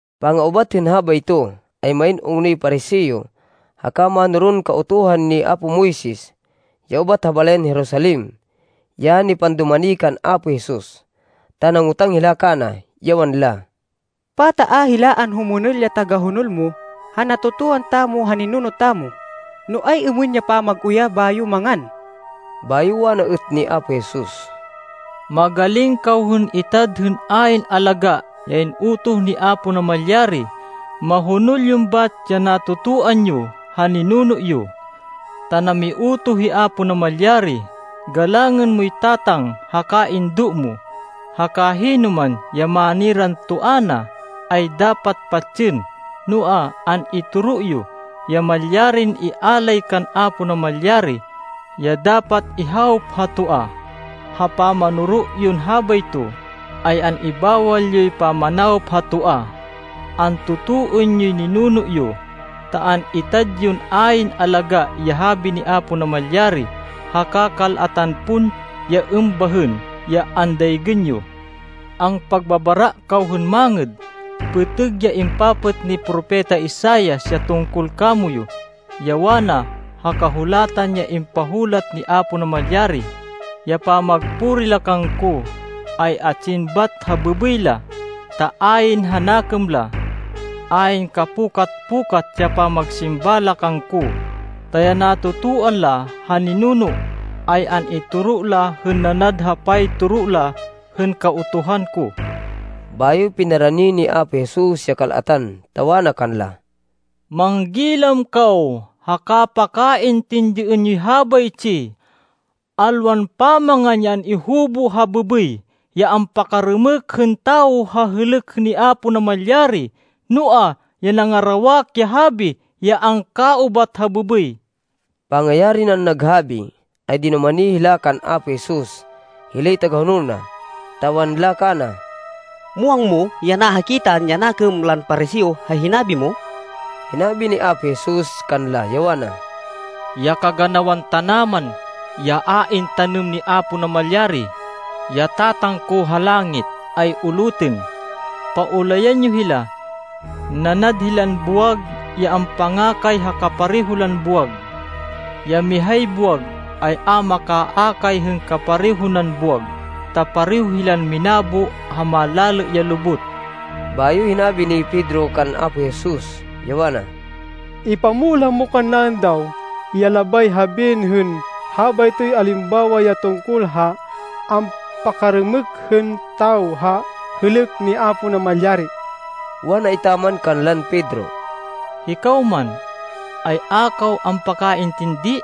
Panga-ubat hên habayto, ay main ungnoy Pariseo haka mánoron Kautuhan ni apo Moises ya ubat ha balayan Jerusalem, ya nipandumani kan Apo Jesus, ta nangotang hila kana, ya wanla, “Pata a hila anhumonol ya tagahonol mo ha natotoan tamo ha ninuno tamo, no ay-êmên ya pamag-uyah bayo mangan?” Bayo wana êt ni Apo Jesus, “Magaling kaw hên itad hên ayn alagá ya in-utoh ni Apo Namalyari, mahonol yon bat ya natotoan yo ha ninuno yo! Ta namiutoh hi Apo Namalyari, ‘Galangên moy tatang haka indo mo,’ haka ‘Hinoman ya maniran toa na, ay dapat patsên.’ Noa, an-itoro yo ya malyarin ialay kan Apo Namalyari, ya dapat ihawop ha toa. Ha pamanoro yon habayto, ay an-ibawal yoy pamanawop ha toa. Antotoên yoy ninuno yo, ta an-itad yon ayn alagá ya Habi ni Apo Namalyari. Haka kal-atan pon ya êmbahên ya andaygên yo. Ampagbabara kaw hên mangêd! Pêtêg ya impapêt ni Propeta Isaias ya tungkol kamoyu, ya wana ha Kahulatan ya impahulat ni Apo Namalyari, ‘Ya pamagpuri la kangko, ay atsin bat ha bêbêy la, ta ayn ha nakêm la. Ayn kapukat-pukat ya pamagsimba la kangko, ta ya natotoan la ha ninuno, ay an-itoro la hên nanad ha paytoro la hên Kautuhan ko.’” Bayo pinarani ni Apo Jesus ya kal-atan, ta wana kanla, “Manggilam kaw haka pakaintindiên yoy habaytsi. Alwan pamangan ya an-ihubo ha bêbêy ya ampakarêmêk hên tawo ha hêlêk ni Apo Namalyari, noa, ya nangarawak ya habi ya angkaubat ha bêbêy.” Pangayari nan naghabi, ay dinumani hila kan Apo Jesus hilay tagahonol na, ta wanla kana, “Muwang mo ya nahakitan ya nakêm lan Pariseo ha hinabi mo?” Hinabi ni Apo Jesus kanla ya wana, “Ya kaganawan tanaman ya a intanêm ni Apo Namalyari, ya Tatang ko ha langit, ay ulutên. Paulayan yo hila. Nanad hilan buwag ya ampangakay ha kapareho lan buwag. Ya mihay buwag ay a makaakay hên kapareho nan buwag, ta pareho hilan minabo ha malalê ya lubot.” Bayo hinabi ni Pedro kan Apo Jesus, ya wana, “Ipamulah mo kannaên daw, ya labay habiên hên habaytoy alimbawa ya tungkol ha ampakarêmêk hên tawo ha hêlêk ni Apo Namalyari.” Wana etaman kanlan Pedro, “Hikaw man, ay a kaw ampakaintindi?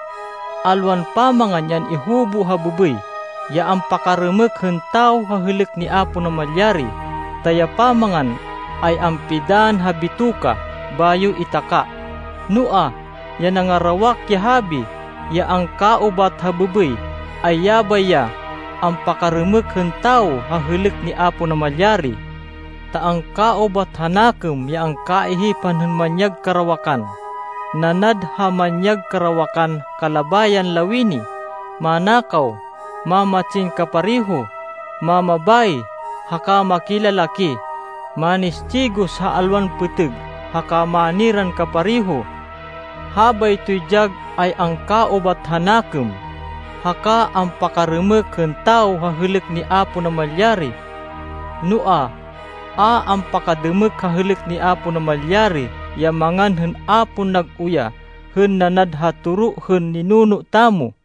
Alwan pamangan ya an-ihubo ha bêbêy ya ampakarêmêk hên tawo ha hêlêk ni Apo Namalyari, ta ya pamangan, ay ampidann ha bitoka bayo itaká. Noa, ya nangarawak ya habi ya angkaubat ha bêbêy, ay yabay ya ampakarêmêk hên tawo ha hêlêk ni Apo Namalyari. Ta angkaubat ha nakêm ya kaihipan hên manyag karawakan, nanad ha manyag karawakan kalabayan lawini, manakaw, mamatsin kapareho, mamabayi haka makilalaki, manistigos ha alwan pêtêg, haka maniran kapareho. Habaytoy dyag ay angkaubat ha nakêm, haka ampakarêmêk hên tawo ha hêlêk ni Apo Namalyari. Noa, a ampakadêmêk ha hêlêk ni Apo Namalyari ya mangan hên a pon nag-uyah, hên nanad ha toro hên ninuno tamo.”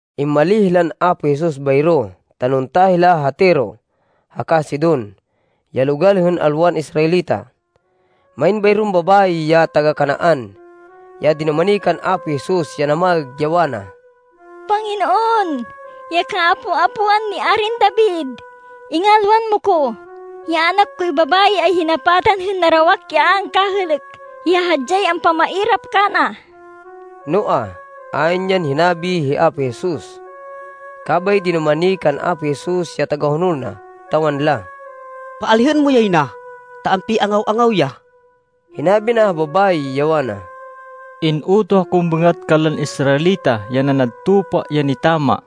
Immalíh hilan Apo Jesus bayro, ta nunta hila ha Tiro haka Sidon, ya logal hên alwan Israelita. Main bayron babayi ya taga-Canaan, ya dinumani kan Apo Jesus, ya namaêg, ya wana, “Panginoon, ya kaapo-apoan ni Arin David! Ingalwan mo ko! Ya anak koy babayi ay hinapatan hên narawak ya a angkahêlêk, ya hadyay ampamairap kana.” Noa, ayn yan hinabi hi Apo Jesus. Kabay dinumani kan Apo Jesus ya tagahonol na ta wanla, “Paalihên mo yay na, ta ampi-angaw-angaw ya.” Hinabi na ha babayi ya wana, “In-utoh akon bêngat kanlan Israelita ya nanad tupa ya nitama.”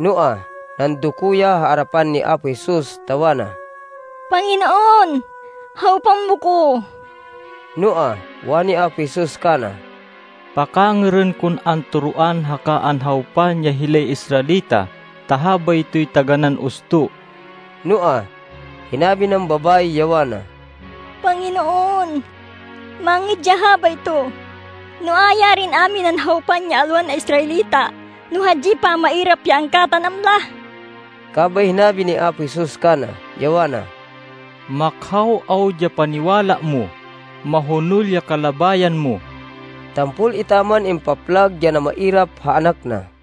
Noa, nandoko ya ha arapan ni Apo Jesus ta wana, “Panginoon, hawpan mo ko!” Noa, wani Apo Jesus kana, “Pakangêrên kon antoroan haka anhawpan ya hilay Israelita. Ta habaytoy taganán usto.” Noa, hinabi nan babayi, ya wana, “Panginoon, mangêd ya habayto, noa, yarin a minan hawpan ya alwan Israelita, no hadyay pamairap ya angkatanam la!” Kabay hinabi ni Apo Jesus kana, ya wana, “Makhaw awud ya paniwala mo! Mahonol ya kalabayan mo!” Tampol etaman impaplag ya namairap ha anak na.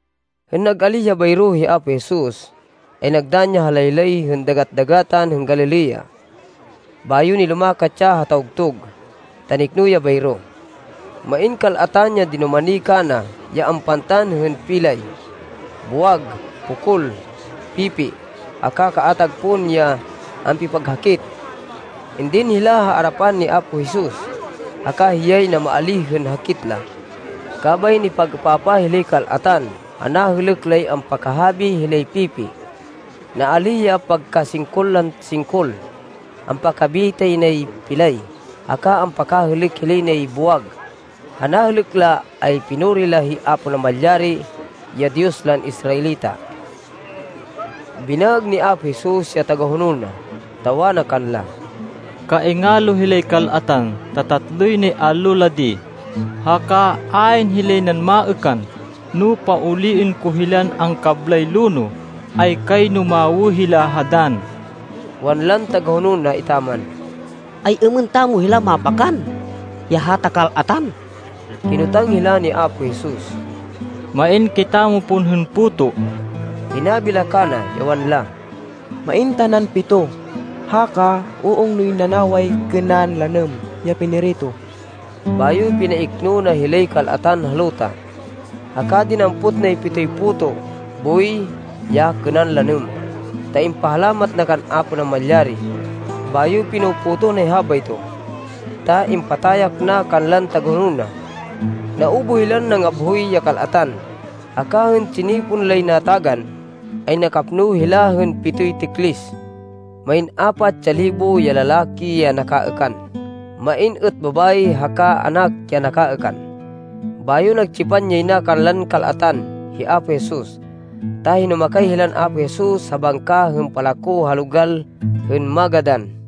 Hên nag-alíh ya bayro hi Apo Jesus, ay nagdann ya ha laylay hên Dagat-dagatan hên Galilea. Bayo nilumakat ya ha tawgtug, ta nikno ya bayro. Main kal-atan ya dinumani kana ya ampantan hên pilay, buwag, pokol, pipi, haka kaatag pon ya ampipaghakit. Indin hila ha arapan ni Apo Jesus, haka hiyay namaalíh hên hakit la. Kabay nipag-êpapah hilay kal-atan ha nahêlêk lay ampakahabi hilay pipi, naalíh ya pagkasingkol lan singkol, ampakabitay nay pilay, haka ampakahêlêk hilay nay buwag. Ha nahêlêk la ay pinuri la hi Apo Namalyari ya Diyos lan Israelita. Binaêg ni Apo Jesus ya tagahonol na, ta wana kanla, “Kaingalo hilay kal-atan, ta tatloy nay allo la di, haka ayn hilay nan maêkan. No pauliên ko hilan angkablay lonoh, ay kayno mawê hila ha dann.” Wanlan tagahonol na etaman, “Ay-êmên tamo hilan mapakan ya hata kal-atan?” Kinotang hila ni Apo Jesus, “Main kitamo pon hên puto?” Hinabi la kana, ya wanla, “Main tanan pito, haka uungnoy nanaway kênan lanêm ya pinirito.” Bayo pinaikno na hilay kal-atan ha luta. Haka dinampot nay pitoy puto boy ya kênan lanêm, ta impahalamat na kan Apo Namalyari, bayo pino-potoh nay habayto, ta impatayak na kanlan tagahonol na. Naubuh hilan nangabhoy ya kal-atan, haka hên tsinipon lay natagan, ay nakapno hila hên pitoy tiklis. Main apat ya libo ya lalaki ya nakaêkan. Main êt babayi haka anak ya nakaêkan. Bayo nagtsipan yay na kanlan kal-atan hi Apo Jesus, ta hinumakay hilan Apo Jesus ha bangka hên palako ha logal hên Magadan.